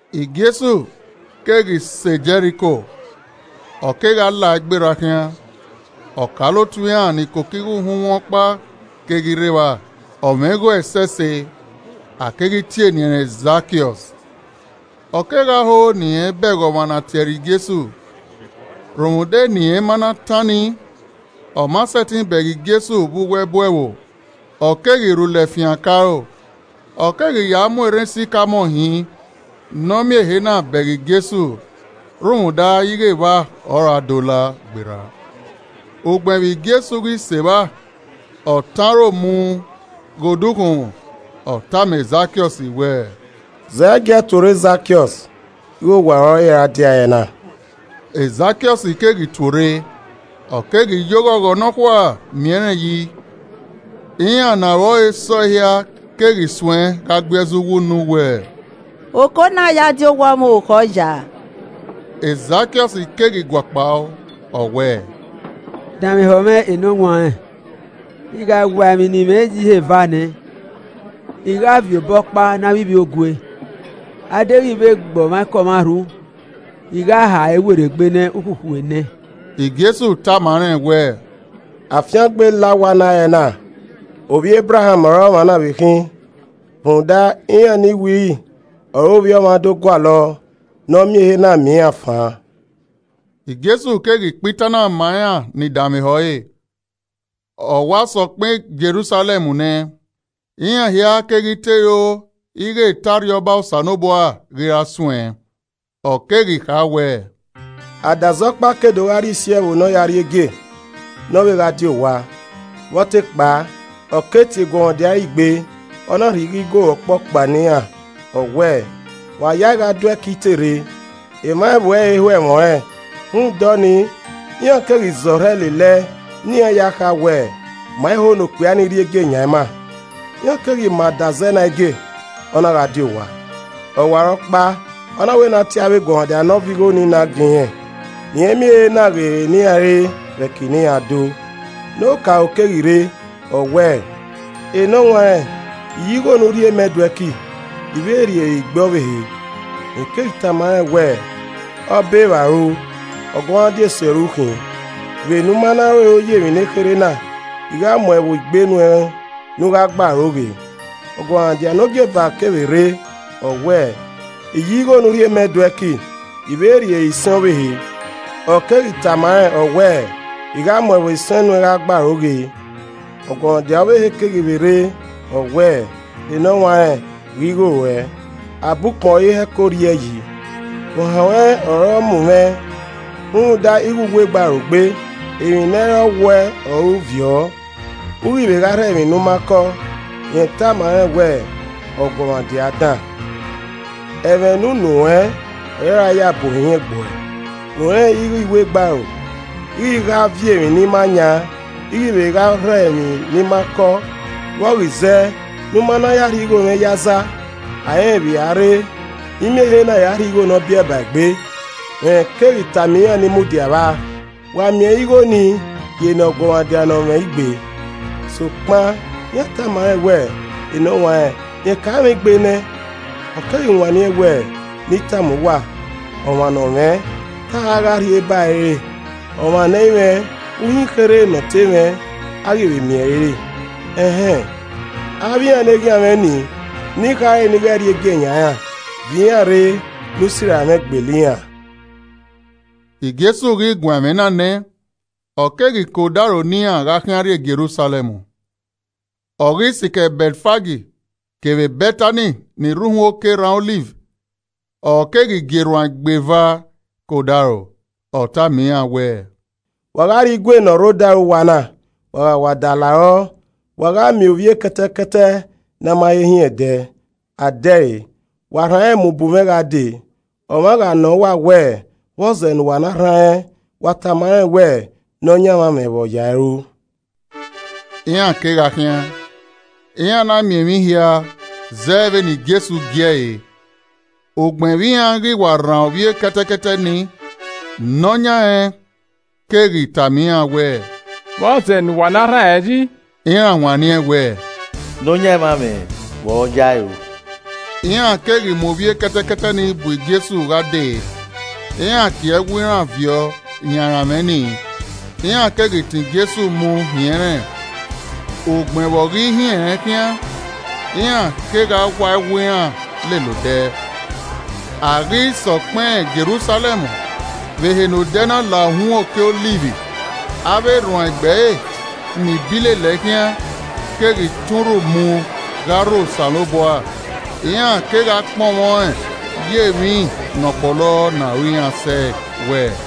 Jesu keghi sẹ Jẹriko, ọ kegha lae gberra khian. Ọkaolotu iran ni koko igho uhunmwu ọkpa keghi rre evba, ọ mwẹ igho ẹsẹse, a keghi tie eni ẹnrẹn Zakiọs. Ọ kegha ho ne ọ bẹghe ọmwa ne a tie ẹre Jesu, rhunmwuda ne irẹn ma na tan nii, ọma sẹtin bẹghe Jesu vbe uwu ẹbu ẹvbo. Ọ keghi rhulẹ fian ke aro, ọ keghi ya mu erhan sikamọ hin ne ọ miẹn ehe na bẹghe Jesu rhunmwuda ighe evba ọ ra do la gberra. Ugbẹn vbe Jesu ghi sẹ evba, ọ tọn aro mu ghe odukhunmwu, ọ tama Zakiọs wẹẹ, “Zẹgiẹ tuorre Zakiọs ighe owa ruẹ ọre I ra dia ẹrẹna.” Zakiọs keghi tuorre, ọ keghi ye oghọghọ nọkhua miẹn rẹn yi. Iran ne aro ẹre se ọe hia keghi suẹn gha gui ẹzọ uwu unu wẹẹ, “Oko na ya di owa ọmwa orukhọ ya!” Zakiọs keghi guakpao, ọ wẹẹ, “Danmwehọ mwẹ enọwanrẹn, I gha waa emwi ne I mwẹ ye ihe eva nẹ, I gha viọ obọkpa ne avbe ivbiogue. Adeghẹ I vbe gbe ọmwaikọmwa rhu, I gha ha ẹre werriegbe nẹẹn ukhukhu enẹ.” Jesu tama rẹn wẹẹ, “Afiangbe la owa na ẹre na, ovbi Ebraham ọre ọmwa na vbe khin. Rhunmwuda iran ni wiri ọre Ovbi Ọmwa do gualọ ne ọ miẹn ehe na miẹn iran fan.” Jesu keghi kpa itan na ma iran ni danmwehọ ẹre, ọ wa sẹ ọkpẹn Jerusalẹm nẹ, iran hia keghi te ro ighe to Arriọba Osanobua ghi ra suẹn. Ọ keghi kha wẹẹ, “Adazẹ ọkpa ke do gha rrie isi ẹvbo ne ọ ya rri egie, ne ọ vbe gha di owa. Vbe ọ te kpao, ọ keghi tie eguọmwadia ẹre igbe, ọ na rhie igho Igoru ọkpọkpa ne iran, ọ wẹẹ, ‘Wa ya ya ẹe gha do ẹki I te rre.’ Emwa ẹvbo ẹre i ho ẹmwẹ ọnrẹn, rhunmwuda ọnii, iran keghi zẹ ọrhẹ lelẹe ne iran ya kha wẹ, ‘Ma i ho ne okpia nii rrie egie yan ima.’ “Iran keghi ma adazẹ na egie, ọ na gha die owa. Ọwarọkpa ọ na wẹ ne a tie avbe eguọmwadia ne ọ viọ igho na nii gie irẹn, ne irẹn miẹn ehe na ghe ere ne iran re vbe ẹki ne iran do. Ne odaro keghi rre, ọ wẹẹ, ‘Enọwanrẹn I ya igho ne u rhie mẹ do ẹki, I vbe rri ere igbe ọvbehe.’ Rẹn keghi tama rẹn wẹẹ, ‘Ọbevbaru, ọguọmwadia esi ọre u khin. Vbene u ma na ru ero ye emwi nekherhe na, I gha mu ẹvbo igbe nuẹn ne u gha gbe aro ghe.’ Ọguọmwadia ne ogieva kevbe rre, ọ wẹẹ, ‘I ya igho ne u rhie mẹ do ẹki, I vbe rri ere isẹn ọvbehe.’ Ọ keghi tama rẹn, ọ wẹẹ, ‘I gha mu ẹvbo isẹn nuẹn gha gbe aro ghe.’ Ọguọmwadia ọvbehe keghi vbe rre, ọ wẹẹ, ‘Enọwanrẹn, ghe igho ruẹ, abọ ukpọn ọre I hẹko rri ẹe yi. Ohan ruẹn ọre ọ mu mwẹ rhunmwuda ighe u wegbe aro gbe, emwi ne ẹ i re ọ wuẹ ọre u viọ, u ghi vbe gha rhọ emwi ne u ma kọ.’ Rẹn tama rẹn wẹẹ, ‘Ọguọmwadia dan, ẹmwẹ ne unu ruẹn ọre I ra ya bu ohiẹn gbe uẹ. U rẹnrẹn ighe I wegbe aro, I ghi gha viọ emwi ne I ma yan, I ghi vbe gha rhọ emwi ne I ma kọ, vbọ ghi zẹ ne u ma na ya rhie igho mwẹ ye aza? A i rẹn vbe i a rre ne I miẹn ehe na ya rhie ẹre rhie igho ne ọ biẹe ba egbe?’ Rẹn keghi tama iran ni mudia vba, ‘Wa miẹn ẹre igho nii rhie ne ọguọmwadia ne ọ mwẹ igbe.’ Sokpan, iran tama rẹn wẹẹ, ‘Enọwanrẹn, rẹn ka mwẹ igbe nẹ!’ Ọ keghi wanniẹn wẹẹ, ‘Ne I tama uwa, ọmwa ne ọ mwẹ, te a ra gha rhie ba ẹre re, ọmwa ne ẹ i mwẹ, uhin ekherhe ne ọ te mwẹ, a ghi vbe miẹn ẹre re. Ẹn hẹn, avbe iran ne eghian mwẹ nii, ni khare ne I ghẹ rrie egie yan iran, viọ iran rre ne u sirra mwẹ gbele iran uan.’” Jesu ghi guan ẹmwẹ na nẹ, ọ keghi ke odaro ne iran gha khian rrie Jerusalẹm. Ọ ghi sikẹ Bẹtfag kevbe Bẹtani ni rre uhunmwu oke erhan Ọliv, ọ keghi gie erhuanegbe eva ke odaro. Ọ tama iran wẹẹ, “Wa gha rrie igue ne ọ rre odaro uwa na, wa gha wa da la rọ, wa gha miẹn ovbi ekẹtẹkẹtẹ ne a ma he hin ẹdẹ, a de ẹre. Wa rhan rẹn mu bu mwẹ gha dee. Ọmwa gha nọ uwa wẹẹ, ‘Vbọzẹ ne uwa na rhan rẹn?’ Wa tama rẹn wẹẹ, ‘Nọyaẹnmwa mwẹ vbe ọ ya ẹe ru.’” Iran kegha khian, iran na miẹn emwi hia zẹ vbene Jesu gie ẹre. Ugbẹn vbe iran ghi wa rhan ovbi ekẹtẹkẹtẹ ni, ne ọ yan rẹn keghi tama iran wẹẹ, “Vbọzẹ ne uwa na rhan rẹn yi?” Iran wanniẹn wẹẹ, “Nọyaẹnmwa mwẹ vbe ọ ya ẹe ru.” Iran keghi mu ovbi ekẹtẹkẹtẹ nii bu Jesu gha dee. Iran kie ẹwu iran viọ yan aranmwẹ nii, iran keghi tọn Jesu mu hin ẹnrẹn. Ugbẹn vbe ọ ghi hin ẹnrẹn khian, iran kegha wa ẹwu iran lele odẹ. A ghi sẹ ọkpẹn Jerusalẹm, vbe ehe ne odẹ na la uhunmwu oke erhan Ọliv, avbe erhuanegbe ẹre ni bi lele ẹe khian keghi tọn urhu mu gha rho Osanobua, iran kegha kpọnmwẹ ọẹn ye emwi ne ọ kpọlọ ne aro iran sẹe wẹẹ,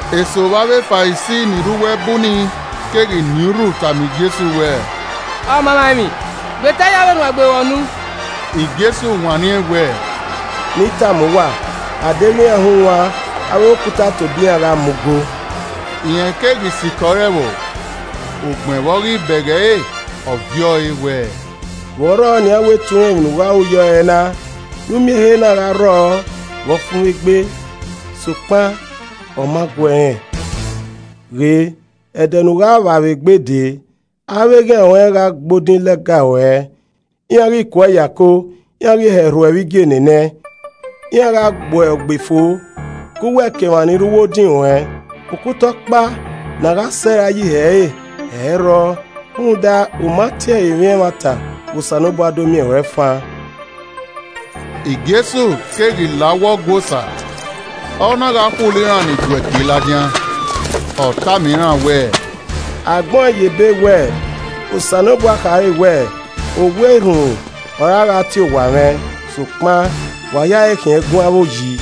Eso vbe avbe Farisi ni rre uwu ẹbu nii keghi nien urhu tama Jesu wẹẹ, “Ọmamwaemwi, gbeta ye avbe erhuanegbe ruẹ unu!” Jesu wanniẹn wẹẹ, “Ne I tama uwa, a deghẹ iran hunwan, avbe okuta tobọ iran gha mu go.” Rẹn keghi sikẹ ore ẹvbo, ugbẹn vbe ọ ghi bẹghe ẹre, ọ viẹ ọe wẹẹ, “Vbe ọ rrọọ nian wẹ te u rẹn emwi ne u gha ru yọ ẹrẹna, ne u miẹn ehe na gha rrọọ vbe ọfumwegbe. Sokpan ọ ma guẹ rẹn. Ghe, ẹdẹ ne u gha vba vbe egbe dee, avbe eghian ruan gha gbe odin lẹga ruẹ, iran ghi ke uẹ ye ako, iran ghi hẹ rhu uẹ vbe igienenẹ. Iran gha gbe uẹ ogbefo, ke uwẹ kevbe emwa ni rre uwu odin ruẹn, okuta ọkpa ne a gha sẹ rae ye ihe ẹre ẹ i rrọọ. Rhunmwuda, u ma tie ẹre emwi ẹmwata vbe Osanobua do miẹn ruẹn fan.” Jesu keghi la uwu Ọgua Osa, ọ na gha khulo iran ni do ẹki ladian. Ọ tama iran wẹẹ, “A gbẹn ọẹn ye ebe wẹ Osanobua kha rre wẹẹ, ‘Owa erhunmwu ọre a gha tie owa mwẹ,’ sokpan wa ya ẹe khian ẹgun avbe oyi!”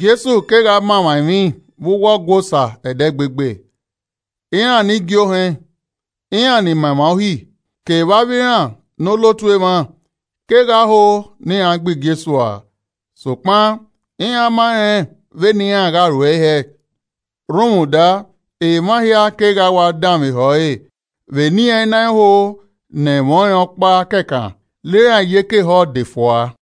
Jesu kegha ma emwa emwi vbe uwu Ọgua Osa ẹdẹgbegbe. Iran ne igie ohẹn, iran ni ma emwa Uhi, kevbe avbe iran ne olotu emwa kegha ho ne iran gbe Jesu ua. Sokpan iran ma rẹn vbene iran gha ruẹe hẹẹ rhunmwuda emwa hia kegha wa danmwehọ ẹre vbene iran i na ho ne ẹmwẹ ọnrẹn ọkpa kẹkan la iran iyeke ehọ de fua.